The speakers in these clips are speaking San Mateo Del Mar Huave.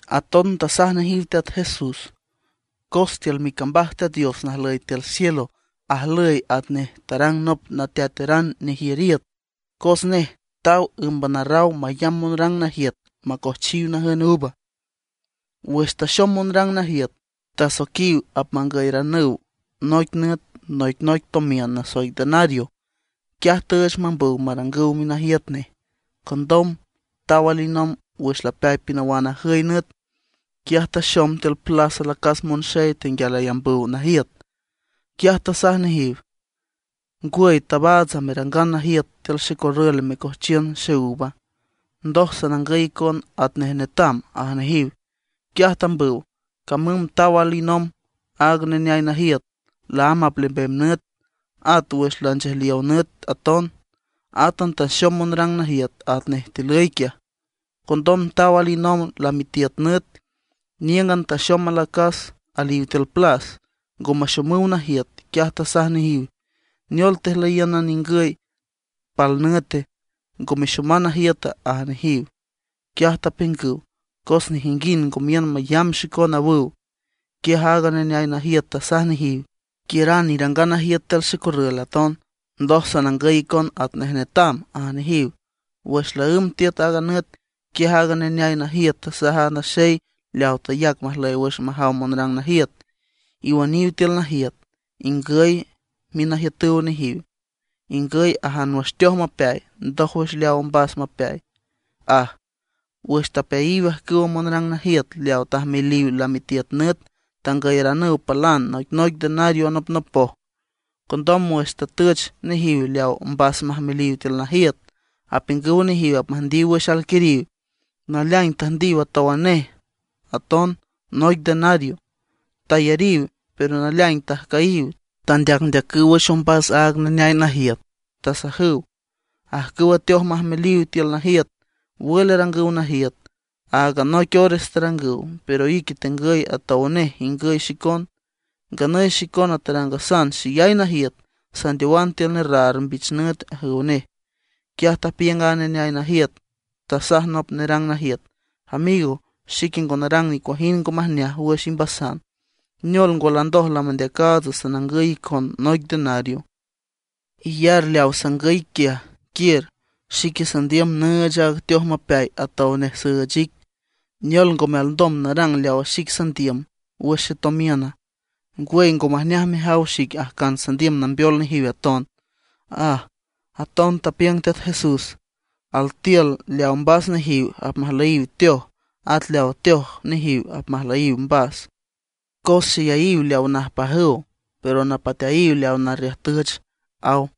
Aton tasaj nejiw Teat Jesús: ―Cos tiül micambaj Teat Dios najlüy tiül cielo, ajlüy atnej tarang nop nateateran nejiür iüt. Cos nej taw ǘmban arraw mayamb monrang najiüt macojchiw najün uva. Wüx taxom monrang najiüt, tasoiquiw apmangüyaranüw noic nüt noicnoic tomiün nasoic denario. Quiaj tüüch mambüw marangüw minajiüt nej. Condom taw alinomb wüx lapeay pinawan ajüy nüt. Quiaj taxom tiül plas alacas monxey tenguial ayambüw najiüt. Quiaj tasaj nejiw: “¿Ngwüy tabaatsa, merangan najiüt tiül xecorrül mecojchiün xeúva? Ndoj sanangüy icon atnej netam”, aj nejiw. Quiaj tambüw. Camüm taw alinomb aaga neneay najiüt laámb aplembem nüt, at wüx lanchejliow nüt aton. Átan taxom monrang najiüt atnej tilüy quiaj. Condom taw alinomb lamitiüt nüt, níüngan taxom alacas aliw tiül plas, ngo maxomüw najiüt. Quiaj tasaj nejiw: “¿Neol tejlüyíünan ningüy pal nüte; ngo mexoman najiüta?”, aj nejiw. Quiaj tapiüngüw: “Cos nejinguind ngo miün mayamb xicon”, awüw. Quiaj aaga neneay najiüt tasaj nejiw: “Quiüran irangan najiüt tiül xecorrül aton, ndoj sanangüy icon atnej netam”, aj nejiw. Wüx laǘmb tiüt aaga nüt, quiaj aaga neneay najiüt tasaj aaga naxey leaw tayac majlüy wüx majaw monrang najiüt: “Iwüniw tiül najiüt, ingüy minajiütüw nejiw. Ingüy ajan wüx teoj mapeay, ndójwüx leaw mbas mapeay”, aj. Wüx tapeayiw ajcüw monrang najiüt leaw tajmeliw lamitiüt nüt, tangüyeranüw palan noicnoic denario anopnopoj. Condom wüx tatüch nejiw leaw mbas majmeliw tiül najiüt, apiüngüw a nejiw apmüjndiw wüx alquiriw; naleaing tüjndiw atówan nej aton noic denario. Tayariw, pero naleaing tajcüyiw, tandeacndeacüw wüx ombas aaga neneay najiüt. Tasajüw: “Ajcüwa teoj majmeliw tiül najiüt, ¿wül arangüw najiüta? Áagan noic ores tarangüw, pero ique tengüy atow nej ingüy xicon. Nganüy xicona tarangasan xeyay najiüt, sandeowan tiül nerraar mbich nüt”, ajüw nej. Quiaj tapiüng aaga neneay najiüt, tasaj nop nerang najiüt: “Amigo, xique ngo narang nicuajind ngo majneaj wüx imbasan. ¿Neol ngwa, landoj lamandeacaatsa sanangüy icon noic denario? Iyar leaw sangüy ic quiaj, quiür. Xique sandiüm nüüch aaga teoj mapeay atow nej süüch ic. ¿Neol, ngome alndom narang leawa xic sandiüm wüx xetomiüna? ¿Ngwüy, ngo majneaj mejaw xic ajcan sandiüm nambeol nejiw aton?” aj. Aton tapiüng Teat Jesús: ―Altiül leawa mbas nejiw, apmajlüyiw teoj, at leawa teoj nejiw apmajlüyiw mbas. Cos xeyayiw leaw najpajüw, pero napateayiw leaw narriüjtüch ―aw.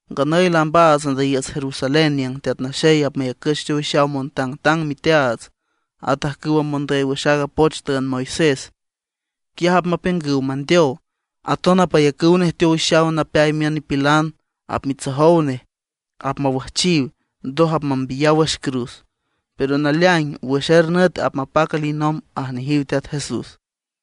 ―Nganüy laambaats andüyiiüts Jerusalén niüng Teat Naxey apmayacüch teowixaw montangtang miteaats at ajcüwa mondüy wüx aaga poch tüünd Moisés. Quiaj apmapiüngüw mandeow. Aton apmayacüw nej teowixaw napeay miün nipilan, apmitsojow nej, apmawüjchiw, ndoj apmambiyaw wüx cruz. Pero naleaing wüx er nüt apmapac alinomb ―aj nejiw Teat Jesús.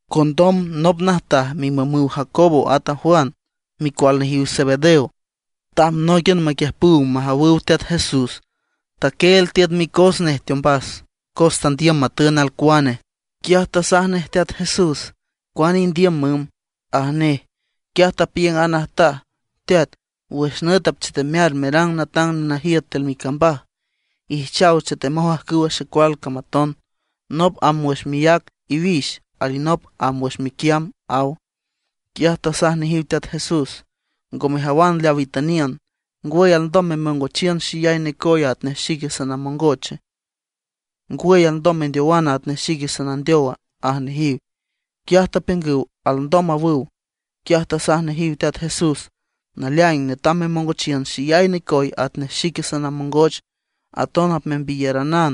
Condom nop najtaj mimümüw a Jacobo at a Juan, micual nejiw Zebedeo, tamb nóiquian maquiüjpüw majawüw Teat Jesús. Taquieel tiüt micos nej teombas cos andiüm matün alcuane. Quiaj tasaj nej Teat Jesús: ―¿Cuane indiüm, müm? ―aj nej. Quiaj tapiüng aaga najtaj: ―Teat, wüx nüt apchetemear merang natang nenajiüt tiül micambaj, ijchaw chetemoj ajcüwa xecual cam aton, nop amb wüx miác iwix alinop amb wüx miquiamb ―aw. Quiaj tasaj nejiw Teat Jesús: ―Ngo mejawan leaw itüniün. ¿Ngwüy alndom memongochiün xeyay necoye atnej xique sanamongoche? ¿Ngwüy alndom mendeowana atnej xique sanandeowa? ―aj nejiw. Quiaj tapiüngüw: ―Alndom ―awüw. Quiaj tasaj nejiw Teat Jesús: ―Naleaing, netam memongochiün xeyay necoy atnej xique sanamongoch, aton apmembiyaranan;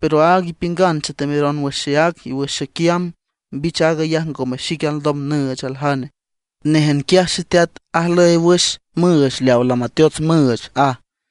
pero aaga ipiüngan chetemeron wüx xeác y wüx xequiamb, mbich aag ayaj ngome xique alndom nüüch aljane, néjan quiaj Xeteat ajlüy wüx müüch leaw lamateots müüch ―aj.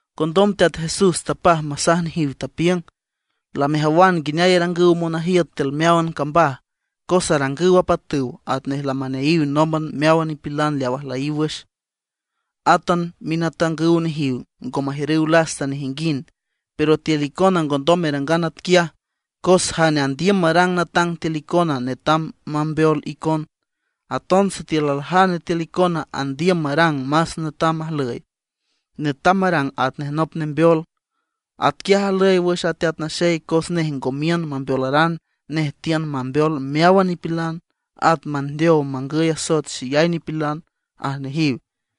Condom Teat Jesús tapaj masaj nejiw, tapiüng: ―Lamejawan nguineay arangüw monajiüt tiül meáwan cambaj, cos arangüw apatüw atnej lamaneayiw nómban meáwan nipilan leaw ajlüyiw wüx; átan minatangüw nejiw ngo majiürüw lasta nejinguind. Pero tiül icona ngondom merangan atquiaj. Cos jane andiüm marang natang tiül icona netam mambeol icon. Aton sitiül aljane tiül icona andiüm marang más netam ajlüy, netam marang atnej nop nembeol. Atquiaj ajlüy wüx a Teat Naxey cos nej ngo miün mambeolaran, nej tiün mambeol meáwan nipilan, at mandeow mangüy asoet xeyay nipilan ―aj nejiw.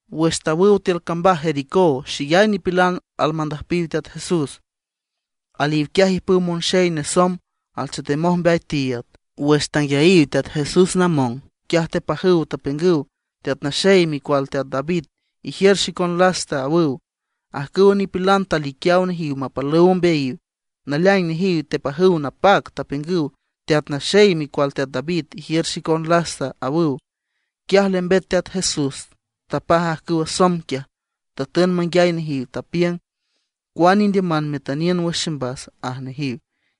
Wüx tawüw tiül cambaj Jericó xeyay nipilan almandüjpiw Teat Jesús. Aliw quiaj ijpüw monxey nesomb, alchetemoj mbeay tiiüd. Wüx tanguiayiw Teat Jesús namong, quiaj tepajüw, tapiüngüw: ―¡Teat Naxey, micual teat David, ijiür xicon lasta! ―awüw. Ajcüwa nipilan taliquiaw nejiw mapalüw ombeayiw, naleaing nejiw tepajüw napac, tapiüngüw: ―¡Teat Naxey, micual teat David, ijiür xicon lasta! ―awüw. Quiaj lembet Teat Jesús, tapaj ajcüwa somb quiaj, tatün manguiay nejiw, tapiüng: ―¿Cuane indiüman metüniün wüx ximbasa? ―aj nejiw.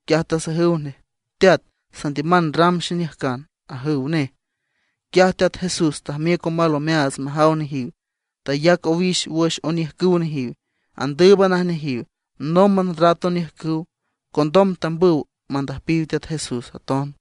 Quiaj tasajüw nej: ―Teat, sandiüman ram xeniüjcan ―ajüw nej. Quiaj Teat Jesús tajmiüc omal omeaats majaw nejiw, tayac owix wüx oniüjcüw nejiw. Andǘüban ajneajiw, nómban rat oniüjcüw. Condom tambüw mandüjpiw Teat Jesús aton.